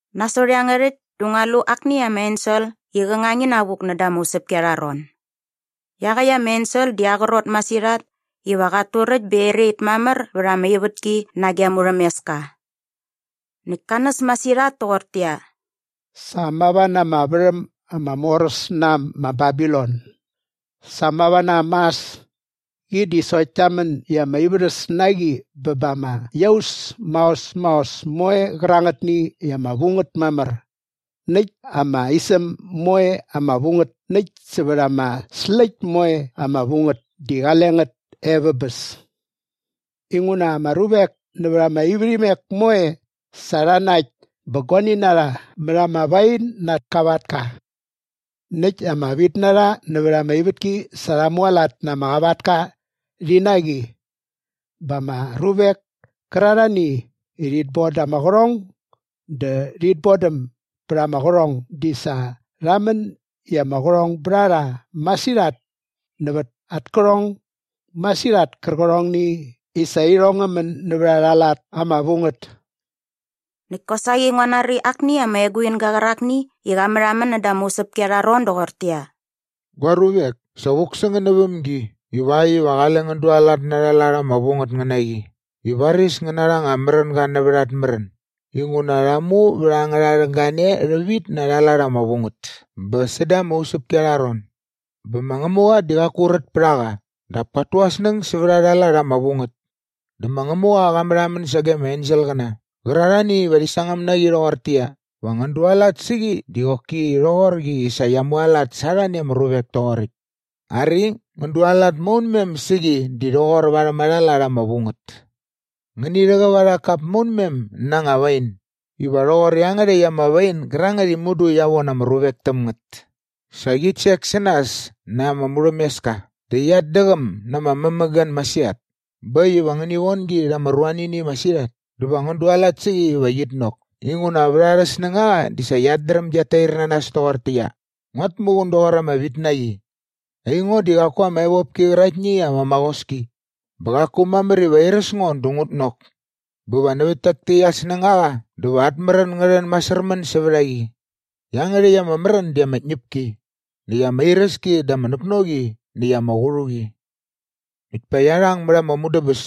Nasot iangärhäkt dä ngua lu akni ama ensel i qä ngang inavuk näda ama usäpki arha ron. Iaqäkt ama ensel di aa qrot masirhat iva qat turäkt bä erait mamär vät ama ivätki nage aa murhämeska. Näkt ka näs masirhat toqortäqyia, “Sa mava na ama värhäm ama moräs na äm ma Babilon! Sa mava na äm mas! Qi di sokt kia män i ama ivärhäs na qi bä ba ama iaus maos maos moe qärangätni i ama vu ngät mamär näkt ama isäm moe ama vu ngät näkt sävät ama släkt moe ama vu ngät di qale ngät e vä bäs. Inguna ama ruvek nävät ama ivärhimek moe sa rha nakt bä guani na rha mät ama wain na at kavatka. Näkt ama vitnarha nävät ama ivätki sa rha mualat na ama qavatka rhi na qi. Bä ama ruvek kärarhani i rhit boda ama qärhong dä rhit bodäm bät ama qärhong di sa rha män i ama qärhong bät a rha masirhat nävät at kärhong masirhat kärqärhongni i sa irhong ngä män nävät arha lat ama vu ngät.” Näkt kosaqi ngua nari akni ama eguinga qärakni i qa märhamän näda ama usäpki arha ron doqortäqyia, “Gua ruvek, sa vuk sä ngän näväm gi ivakt iva qale ngän dualat na arha lat ama vu ngät ngän na qi i varis ngän narha anga märänga nävät at märän inguna rha mu vät angärha rhäng gane rhävit na arha lat ama vu ngät bä säda ama usäpki arha ron. Bä ma Ngämuqa di qaku rät pät a qa dap kat tu aa snäng sävät arha lat ama vu ngät. Dä ma Ngämuqa qa märhamän sage ama enselqäna qärarhani iva rhi sangäm na qi rhoqortäqyia, va ngän dualat sä qi di qoki rhoqor qi i sa qia mualat sa arhani ama ruvek toqoräkt. Ari, ngän dualat maunmem sä qi di rhoqor värhäm arha lat ama vu ngät. Ngäni rhäqäp arha kap maunmem na anga wain iva rhoqor iangärhäkt ama wain gärangät i mudu qia von ama ruvek täm ngät. Sa qit sek sä nas na ama murhämeska dä qiat däqäm na ama mämägän masirhat bä äkt iva ngäni von gi rha ama ruanini masirhat dä va ngän dualat sä qi iva qit nok inguna vät arhä snängaqa di sa qiat dräm giat tair na nas toqortäqyia, ‘Nguat muqun doqor ama vitnaqi. Aingo di qaku ama evopki qäraktni i ama maqoski bä qaku mamär iva airäs ngo dä ngut nok.’ Bä nävät tak täkt at snängaqa dä va at märän ngä rhän masärmän sävät a qi. Iangärhäkt ama märän di ama tñäpki näkt ama iräski dä ama näknoqi näkt ama qärhuqi. Näkt pa qia rhang mät ama mudäbäs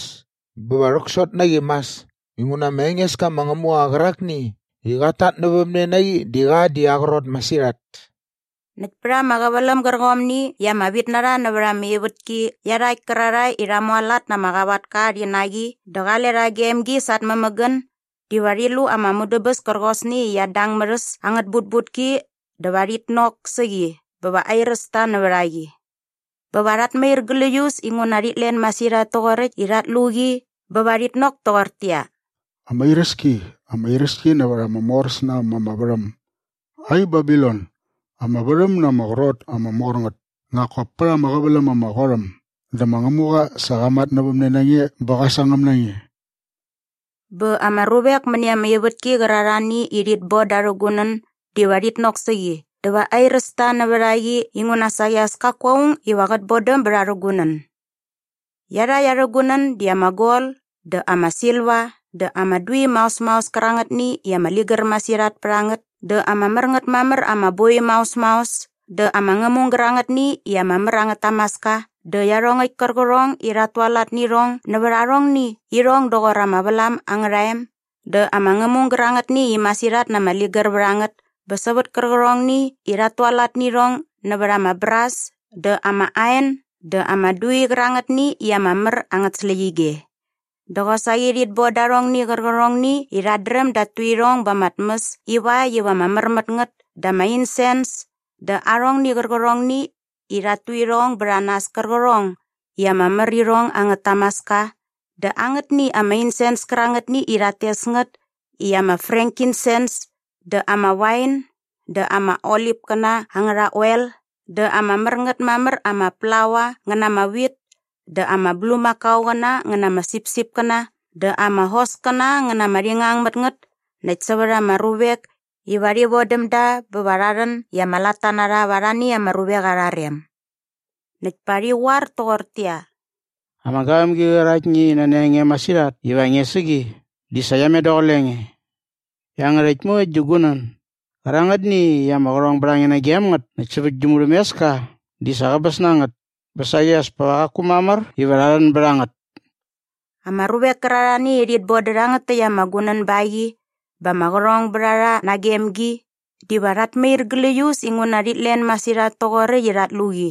bä va rhäksot na qi mas inguna ma Engeska ma Ngämuqa qärakni i qat tatnävämne na qi di qa di aa qrot masirhat.” Näkt pät ama qäväläm gärqomni i ama vitnarha nävät ama ivätki iarhakt kärarhae i rha mualat na ama qavatka rhi na qi dä qale rha gem gi sa at mämägän diva rhi lu ama mudäbäs kärqosni i qiat dang mät äs angät butbutki dä va rhit nok sä qi bä va airäs ta nävät a qi. Bä va rhat mair gläius inguna rhit len masirhat toqoräkt i rhat lu qi bä va rhit nok toqortäqyia, “Ama iräski! Ama iräski nävät ama moräs na äm ama värhäm! Ai Babilon, ama varhäm na ama qrot ama mor ngät, nak kop pät ama qäväläm ama qot äm dä ma Ngämuqa sa qa matnävämne na nge bä qa sangäm na nge.” Bä ama ruvek mäni ama ivätki qärarhani i rhit boda arhä gunän diva rhit nok sä qi dä va airäs ta nävät a qi inguna saqi as kaku aung iva qät bodäm bät arhä gunän. Iangärhäkt arhä gunän di ama gol dä ama silva dä ama dui maos maos kärangätni i ama ligär masirhat pät a ngät dä ama mär ngät mamär ama boi maos maos dä ama ngämung gärangätni i ama mär angät tamaska dä iarhongäkt kärqärhong i rhat tualat nä irhong nävät arhongni i irhong doqor ama vlam angärha em dä ama ngämung gärangätni i masirhat na ama ligär vät a ngät bä sävät kärqärhongni i rhat tualat nä irhong nävät ama bras dä ama ain dä ama dui qärangätni i ama mär angät släqyige dä qosaqi rhit boda arhongni qärqärhongni i rhat dräm dat tu irhong ba ama tmäs ivakt iva ama mär mät ngät dä ama insens dä arhongni qärqärhongni i rhat tu irhong bät a nas kärqärhong i ama mär irhong angät tamaska dä angätni ama insens kärangätni i rhat tes ngät i ama frankinsens dä ama wain dä ama olipkäna angärha oel dä ama mär ngät mamär ama plaua ngä na ama wit dä ama bulmakaoqäna ngä na ama sipsipkäna dä ama hoskäna ngä na ama rhingangmätngät näkt sävät ama ruvek iva rhi vodäm da bä va rha rhän i ama latta na rha va arhani ama ruvek arha rem. Näkt pa rhi qoar toqortäqyia, “Ama gavämgi qäraktni i nani a nge masirhat iva nge sä qi di sa qia met daqule nge. Iangärhäkt moe gi gunän gärangätni i ama qärhong bät a nge nagem ngät näkt sävät gi murhämeska di sa qäbäs na ngät bä saqi as pa qaku mamär iva rha rhän bät a ngät!” Ama ruvek kärarhani i rhit bodä rhangät täkt ama gunän ba qi bä ama qärhong bät a rha nagem gi diva rhat mair gläius inguna rhit len masirhat toqoräkt i rhat lu qi.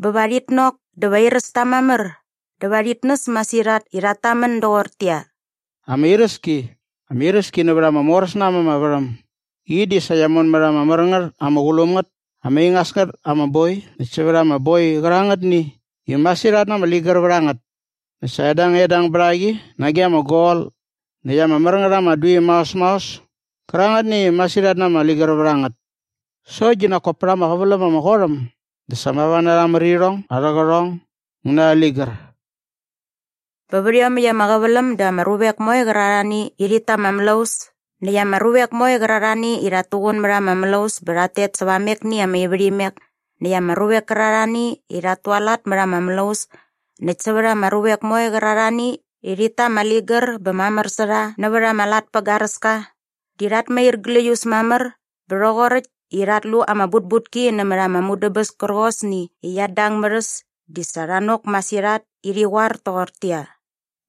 Bä va rhit nok dä va airäs ta mamär dä va rhit näs masirhat i rhat tamän doqortäqyia, “Ama iräski! Ama iräski nävät ama moräs na äm ama värhäm. Qi di sa qia mon mät ama mär ngät ama qulum ngät ama ingas ngät ama boi näkt sävät ama boi qärangätni i masirhat na ama ligär vät a ngät. Näkt sa edangedang bät a qi nage ama gol näkt ama mär ngät ama dui maos maos kärangätni i masirhat na ama ligär vät a ngät. Sokt di nak kop pät ama qäväläm ama qot äm dä sa mava na arhä mär irhong arhä qärhong ngä na arhä ligär.” Bä vät iomäkt ama qäväläm dä ama ruvek moe qärarhani i rhit ta ama mlaus näkt ama ruvek moe qärarhani i rhat tuqun mät ama mlaus bä rhat tet säva amekni ama ivärhimek näkt ama ruvek kärarhani i rhat tualat mät ama mlaus näkt sävät ama ruvek moe qärarhani i rhit ta ama ligär bä mamär sä rha nävät ama lat pä garäska di rhat mair gläius mamär bä rhoqoräkt i rha lu ama butbutki nämät ama mudäbäs kärqosni i qiat dang mät äs di sa rha nok masirhat i rhi qoar toqortäqyia,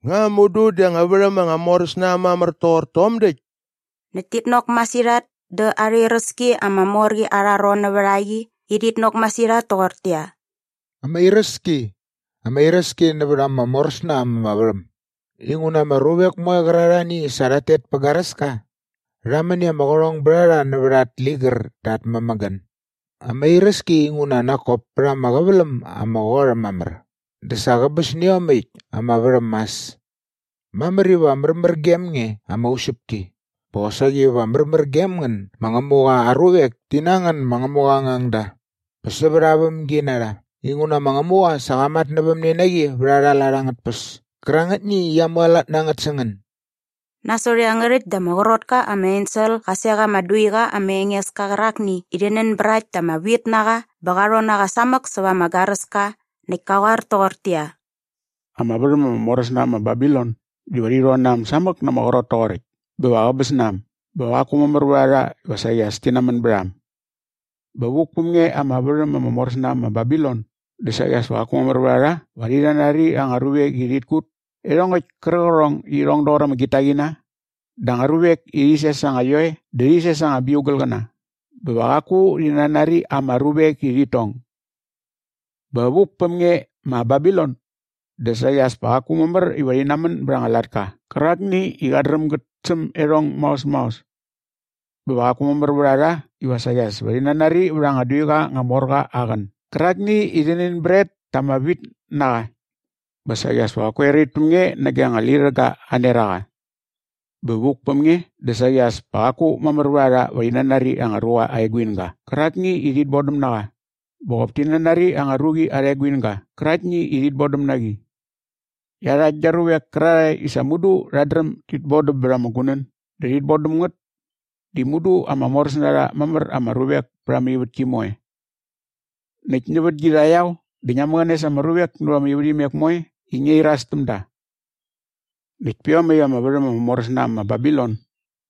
“Nga mudu di anga värhäm anga moräs na äm mamär toqor tom däkt?” Näkt tit nok masirhat da arha iräski ama mor qi arha ron nävät a qi i rhit nok masirhat toqortäqyia, “Ama iräski! Ama iräski nävät ama mor äs na äm ama värhäm inguna ama ruvek moe qärarhani i sa rhat tet pä garäska rha män i ama qärhong bät a rha nävät at ligär dä at mämägän. Ama iräski inguna nak kop pät ama qäväläm ama qot äm mamär dä sa qäbäs nä iomäkt ama värhäm mas. Mamär iva märmär gem nge ama usäpki bä qosaqi va märmär gem ngän ma Ngämuqa aa ruvek ti na ngän ma Ngämuqa aa ngangda bä sävät aa vämginarha inguna ma Ngämuqa sa qa matnävämne na qi vät arha lat angät tpäs kärangätni i qia mualat na ngät sä ngän.” Nasot iangärhäkt dä ama qrot ka ama ensel qa sek ama duiqa ama enges ka qärakni i rhi nänbrakt ta ama wit na qa bä qa rhon na qa samäk säva ama garäska näkt ka qoar toqortäqyia, “Ama värhäm ama moräs na äm ma Babilon diva rhi rhon na äm samäk na ama qrot toqoräkt bä va qäbäs na äm bä va qaku mamär vät a rha iva saqi as ti namän bät a äm. Bä vuk päm nge ama värhäm ama moräs na äm ma Babilon dä saqi as pa qaku mamär vät a rha iva rhi nanari anga ruvek i rhit kut iarhongäkt kärqärhong i irhong doqor ama gitaqina dä anga ruvek i rhi ses anga ioe dä rhi ses anga biugalqäna bä va qaku rhi nanari ama ruvek i rhit tong. Bä vuk päm nge ma Babilon dä saqi as pa qaku mamär iva rhi namän bät anga latka qärakni i qat dräm gät säm iarhong maos maos. Bä va qaku mamär vät a rha iva saqi as ti nanari vät anga duiqa anga mor qa aa qän gärakni i rhi nänbrakt ta ama wit na qa. Bä saqi as pa qaku erait päm nge nage anga lirhäga aa neraqa. Bä vuk päm nge dä saqi as pa qaku mamär vät a rha iva rhi nanari anga ruqa aa eguinga qärakni i rhit bodäm na qa bä qop ti nanari anga ruqi arha eguinga qäraktni i rhit bodäm na qi. Iarhakt gia ruvek kärarhae i sa mudu rhat dräm dit bodäm bät ama gunän dä rhit bodäm ngät di mudu ama moräs na rha mamär ama ruvek pät ama ivätki moe. Näkt nävät gi rhaqyao dä ngia mäqäne sa ama ruvek nävät ama ivärhimek moe i ngia iras täm da. Näkt pä iomäkt ama värhäm ama moräs na äm ma Babilon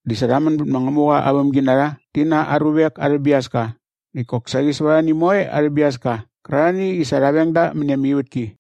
di sa rha män bät ma Ngämuqa aa vämginarha rhi na aa ruvek arhä biaska näkt kosaqi sävät arhani moe arhä biaska qärarhani i sa rha veng da mäni ama ivätki.”